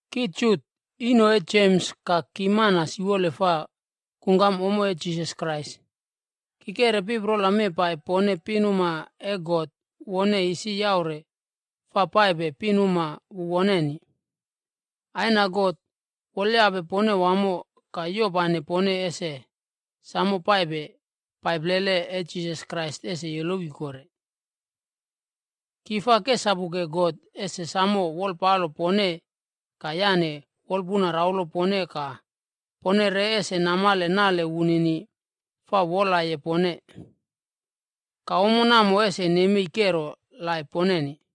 Ki Jut, ino e Jems ka ki mana siwole fa kungkam ommo e Jisas Krais. Ki keꞌre piprola mee pai pone pinuma e God wone isi yaure fa paipe pinuma wu woneni. Aina God wolyape pone wamo ka yopane pone ese samo paipe pai plele e Jisas Krais ese yolowi kore. Ki fa kesapuke God ese samo wolpalo pone ka yane wolpuna raulo pone ka pone re ese namale nale wunini fa wolaye pone. Ka ommo namo ese nemei kero laip poneni.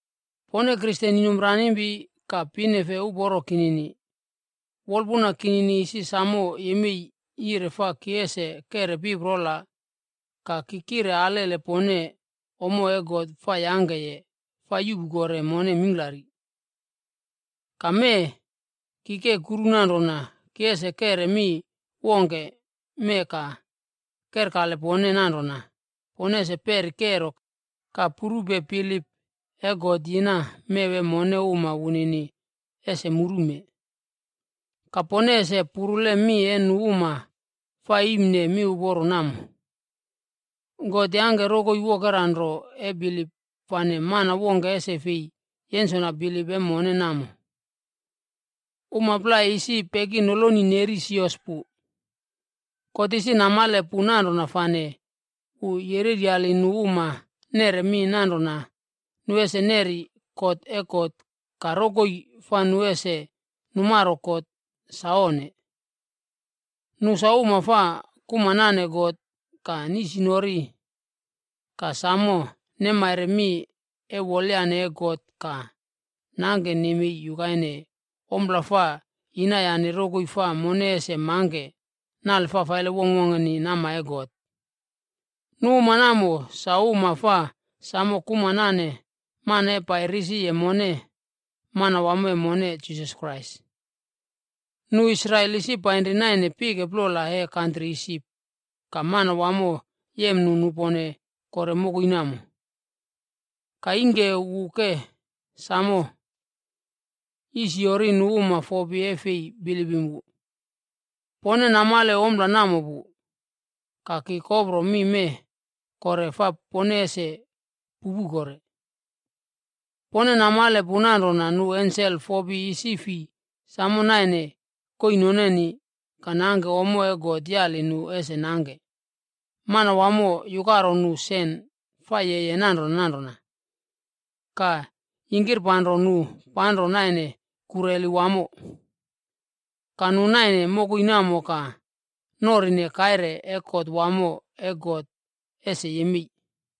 Pone Kristen inomranimpi ka pinefe uporo kinini, wolpuna kinini isi samo yemei yire fa ki ese keꞌre piprola ka kire alele pone ommo e God fa yangkeye fa yuꞌpu kore mone mingklari. Ka mee, ki ke kuru nanrona ki ese keꞌre mi wongke mee ka kerkale pone nanrona, pone ese peri kero ka purupe bilip e God yina mew e mone uma wunini ese murume. Ka pone ese purule mi e nu uma fa iimne miuporo namo. God yangke rokoi wokera nro e bilip fane mana wongke ese fi yensona bilip e mone namo. Uma plai isi peki noloni neri sios pu. God isi namale pu nanrona fane wu yereryali nu uma neꞌre mi nanrona nu ese neri kot e God ka rokoi fa nu ese numaro kot sa onne. Nu sa uma fa kuma nane God ka nisinori ka samo nemaire mi e wolyane e God ka nangke nemei yukaine ompla fa yinayane rokoi fa mone ese mangke nale fafaile wongkwongkeni nama e God. Nu uma namo, sa uma fa samo kuma nane mana e pai risi mone, Manawamo e mone Jisas Krais. Nu Israel isi painri naine pike plola e kantri Isip ka Manawamo yem nu nupone kore mokoi namo. Ka ingke, wu ke samo yisyori nu uma fopi e fei bilipim wu.a Pone namale ompla namo pu. Ka ki kopro mi mee kore fai pone ese pupu kore. Pone namale pu nanrona nu ensel fopi isi fi samo naine koii nonenib ka nangke ommo e God yali nu ese nangke, Manawamo yukaro nu sen fa yeye nanrona nanrona, ka yingkirpanro nu panro naine kureli wamo. Ka nu naine mokoi namo ka norine kaire e kot wamo e God ese yemei.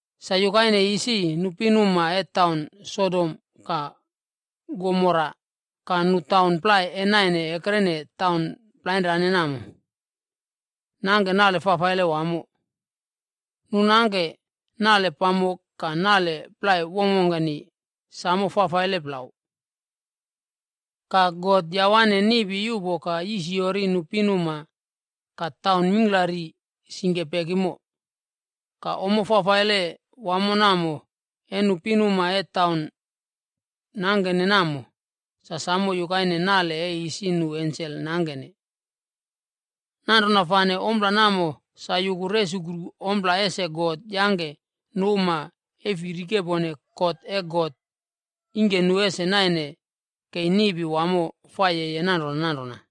Sa yukaine isi, nu pinuma e taun Sodom ka Gomora ka nu taun plai e naine ekrene taun plainrane namo, nangke nale fafaile wamo. Nu nangke nale pamok ka nale plai wongkwongkeni sam faifaile plau. Ka God yawane niꞌpi yuꞌpo ka yisiyori nu pinuma ka taun mingklari singke pekimo. Ka ompla fafaile wamo namo e nu pinuma e taun nangkene namo, sa samo yukaine nale e isi nu ensel nangkene. Nanrona fane ompla namo sa yuku resukru ompla ese God yangke nu uma e fi rikepone kot e God, ingke nu ese naine kei niꞌpi wamo fa yeye nanrona nanrona.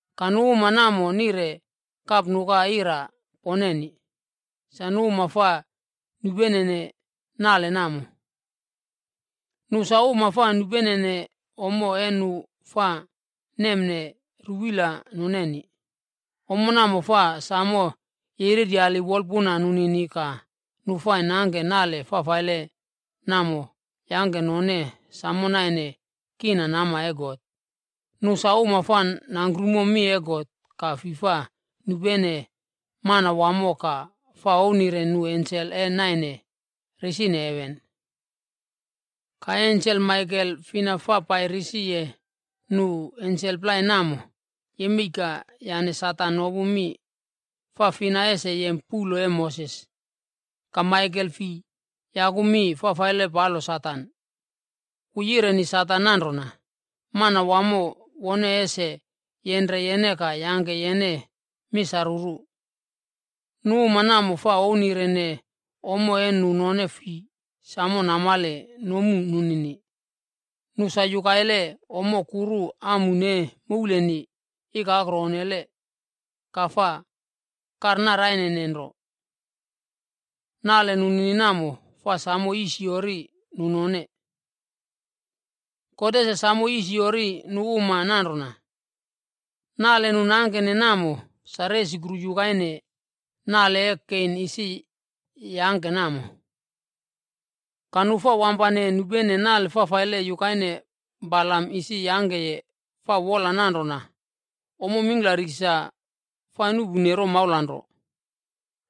Ka nu uma namo nire kapnuka ira poneni, sa nu uma fa nupenene nale namo. Nu sa uma fa nupenene ommo e nu fa nemne ruwila noneni, ommo namo fa samo yereryali wolpuna nunini ka nu fa nangke nale fafaile namo yangke nu none samo naine kina nama e God. Nu sa uma fa nangkrumo mi e God ka fi fa nupene Manawamo ka fa ouwnire nu ensel e naine risine heven. Ka e ensel Maikel fina fa pai risi nu ensel plai namo, yemei ka yane Satan nopu mi fa fina ese yem puꞌlo e Moses. Ka Maikel fi yaku mi fafaile palo Satan. Wu yireni Satan nanrona, “Manawamo wone ese yenre yene ka yangke yene misaruru.” Nu uma namo fa ouwnirene ommo e nu none fi samo namale nomu nunini. Nu sa yukaile ommo kuru amun e mouleni ikakro onnele ka fa karnaraine nro. Nale nunini namo, fa samo yisiyori nu none. God ese samo yisiyori nu uma nanrona. Nale nu nangkene namo, sa resukru yukaine nale e Kein isi yangke namo.c Ka nu fa wampane nupene nale fafaile yukaine Balamd isi yangkeye fa wola nanrona ommo mingklari sa fa nuꞌpune romaula nro.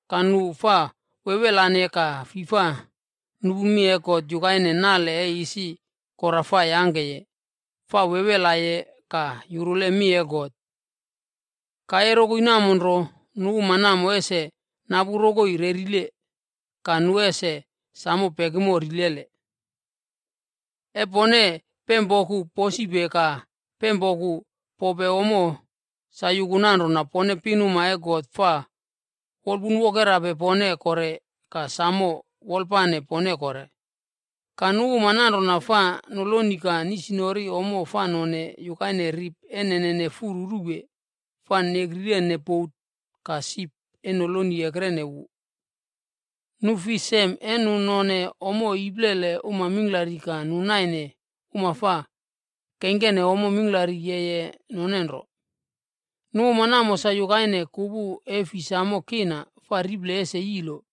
Ka nu fa wewelane ka fi fa nupu mi e God yukaine nale e isi Kora fa yangkeye fa wewelaye ka yurule mi e God.e Ka e rokoi namo nro, nu uma namo ese napu rokoi rerile, ka nu ese sam pekimo rilele. E pone pempoku posipe ka pempoku pope ommo, sa yuku nanrona pone pinuma e God fa wolpunwokerape pone kore ka samo wolpane pone kore. Ka nu uma nanrona fa noloni ka nisinori ommo fa none yukaine rip e nene furu ruwe fa nekrirene bot ka sip e noloni ekrene wu.f Nu fi sem e nu none ommo iplele uma mingklari ka nu naine uma fa keingkene ommo mingklari yeye none nro. Nu uma namo sa yukaine kupu e fi samo kina fa riple ese yilo,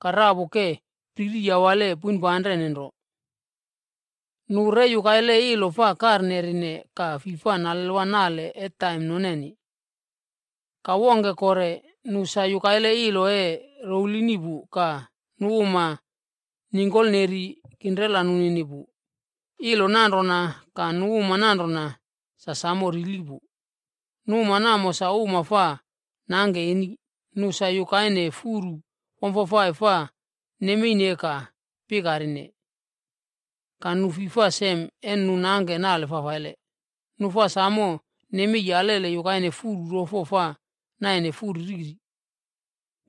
ka rapu ke priri yawale poinpanre nro. Nu re yukaile ilo fa karnerine ka fi fa nalelwa nale e taim noneni. Ka wongke kore, nu sa yukaile ilo e rouwlini pu ka nu uma ningkolneri kinrela nunini pu. Ilo nanrona ka nu uma nanrona, sa samo rili pu. Nu uma namo sa uma fa nangke eni. Nu sa yukaine furu wamfafai fa nemeine ka pikarine. Ka nu fi fa sem e nu nangke nale fafaile. Nu fa samo nemei alele yukaine furu rofo fa naine furu riri.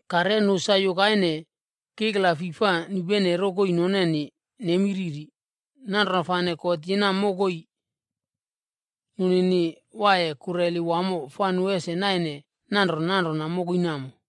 Ka re nu sa yukaine kikla fi fa nupene rokoi noneni nemi riri. Nanrona fane God yina mokoi nunini waiye kureli wamo fa nu ese naine nanrona nanrona mokoi namo.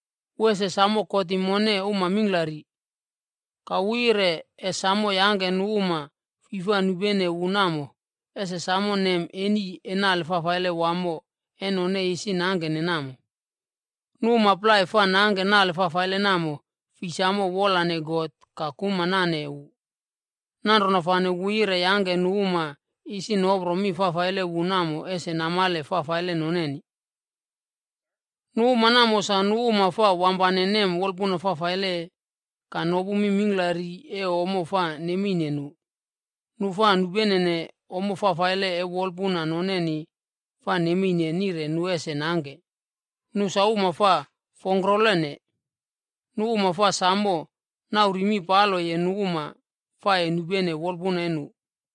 Wu ee samo kotim mone uma mingklari. Ka wu yire e samo yangke nu uma fi fa nupene wu namo, ese samo nem eni e nale fafaile wamo e none isi nangkene namo. Nu uma plai fa nangke nale fafaile namo, fi samo wolane God ka kuma nane wu. Nanrona fane, wu yire yangke nu uma isi nopro mi fafaile wu namo ese namale fafaile noneni.g” Nu uma namo, sa nu uma fa wampane nem wolpuna fafaile, ka nopu mi mingklari e ommo fa nemeine nu. Nu fa nupenene ommo fafaile e wolpuna noneni fa nemeine nire nu ese nangke. Nu sa uma fa fongkrolene. Nu uma fa samo nauri mi paloye nu uma fa e nupene wolpuna e nu.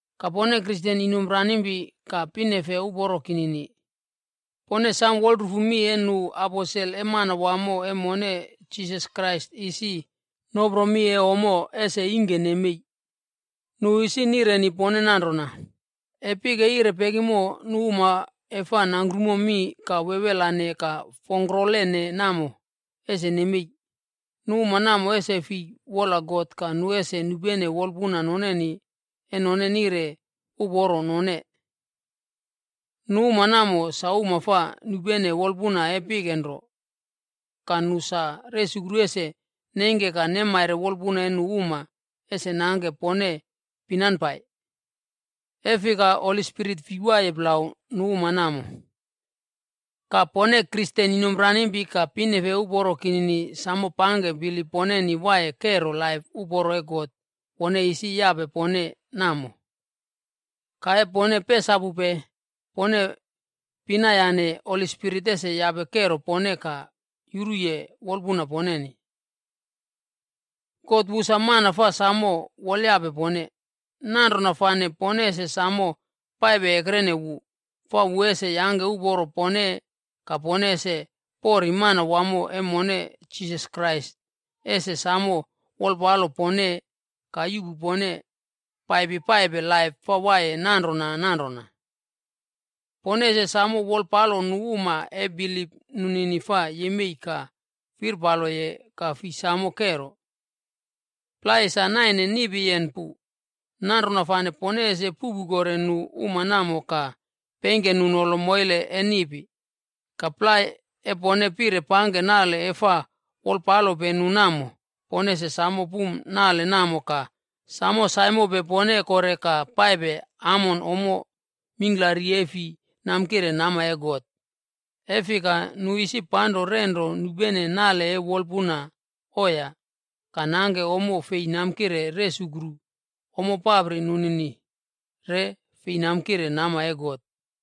Ka pone Kristen inomranimpi ka pinefe uporo kinini, pone sam wolrufu mi e nu aposel e Manawamo e mone Jisas Krais isi nopro mi e ommo ese ingke nemei. Nu isi nireni pone nanrona, “E pike yire pekimo, nu uma e fa nangkrumo mi ka wewelane ka fongkrolene namo, ese nemei. Nu uma namo ese fi wola God ka nu ese nupene wolpuna noneni e none nire uporo none.” Nu uma namo, sa uma fa nupene wolpuna e pike nro ka nu sa resukru ese neingke ka nemaire wolpuna e nu uma ese nangke pone pinanpai. E fika, Holi Spirit fi waiye plau nu uma namo. Ka pone Kristen inomranimpi ka pinefe uporo kinini sam pangke bilip poneni waiye kero laip uporo e God wone isi yape pone namo. Ka e pone pesapupe, pone pinayane Holi Spirit ese yape kero pone ka yuruye wolpuna poneni. God wu sa mana fa samo wolyape pone. Nanrona fane pone ese samo paipe ekrene wu, fa wu ese yangke uporo pone ka pone ese pori Manawamo e mone Jisas Krais ese samo wolpalo pone ka yuꞌpu pone paipi paipe laip fa waiye nanrona nanrona. Pone ese samo wolpalo nu uma e bilip nunini fa yemei ka firpaloye ka fi samo kero. Plai, sa naine niꞌpiyen pu. Nanrona fane pone ese puꞌpu kore nu uma namo ka peingke nu nolo moile e niꞌpi. Ka plai, e pone pire pangke nale e fa wolpalope nu namo, pone ese samo pum nale namo ka samo saimope pone kore ka paipe amon ommo mingklari e fi namkire nama e God. E fika, nu isi panro renro nupene nale e wolpuna oiya ka nangke ommo fei namkire resukru ommo papri nunini re fei namkire nama e God.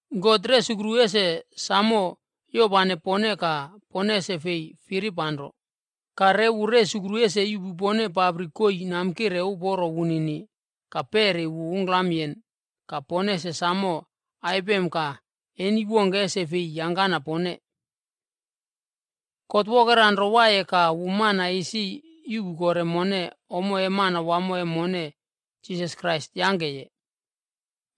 God resukru ese samo yopane pone ka pone ese fi firipanro. Ka re wu resukru ese yuꞌpu pone papri koii namkire uporo wunini ka peri wu ungklamyen ka pone ese samo aipem ka eni wongke ese fi yangkana pone. God wokera nro waiye ka wu mana isi yuꞌpu kore mone ommo e Manawamo e mone Jisas Krais yangkeye.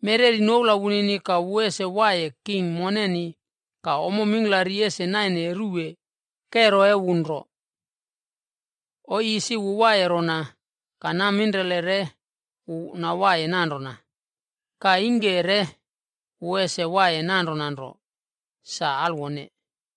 Mereri noula wunini ka wu ese waiye king moneni ka ommo mingklari ese naine ruwe kero e wu nro. Oii isi wu waiye rona ka naminrele re wu nawaiye nanrona ka ingke re wu ese waiye nanrona nro. Sa alwone.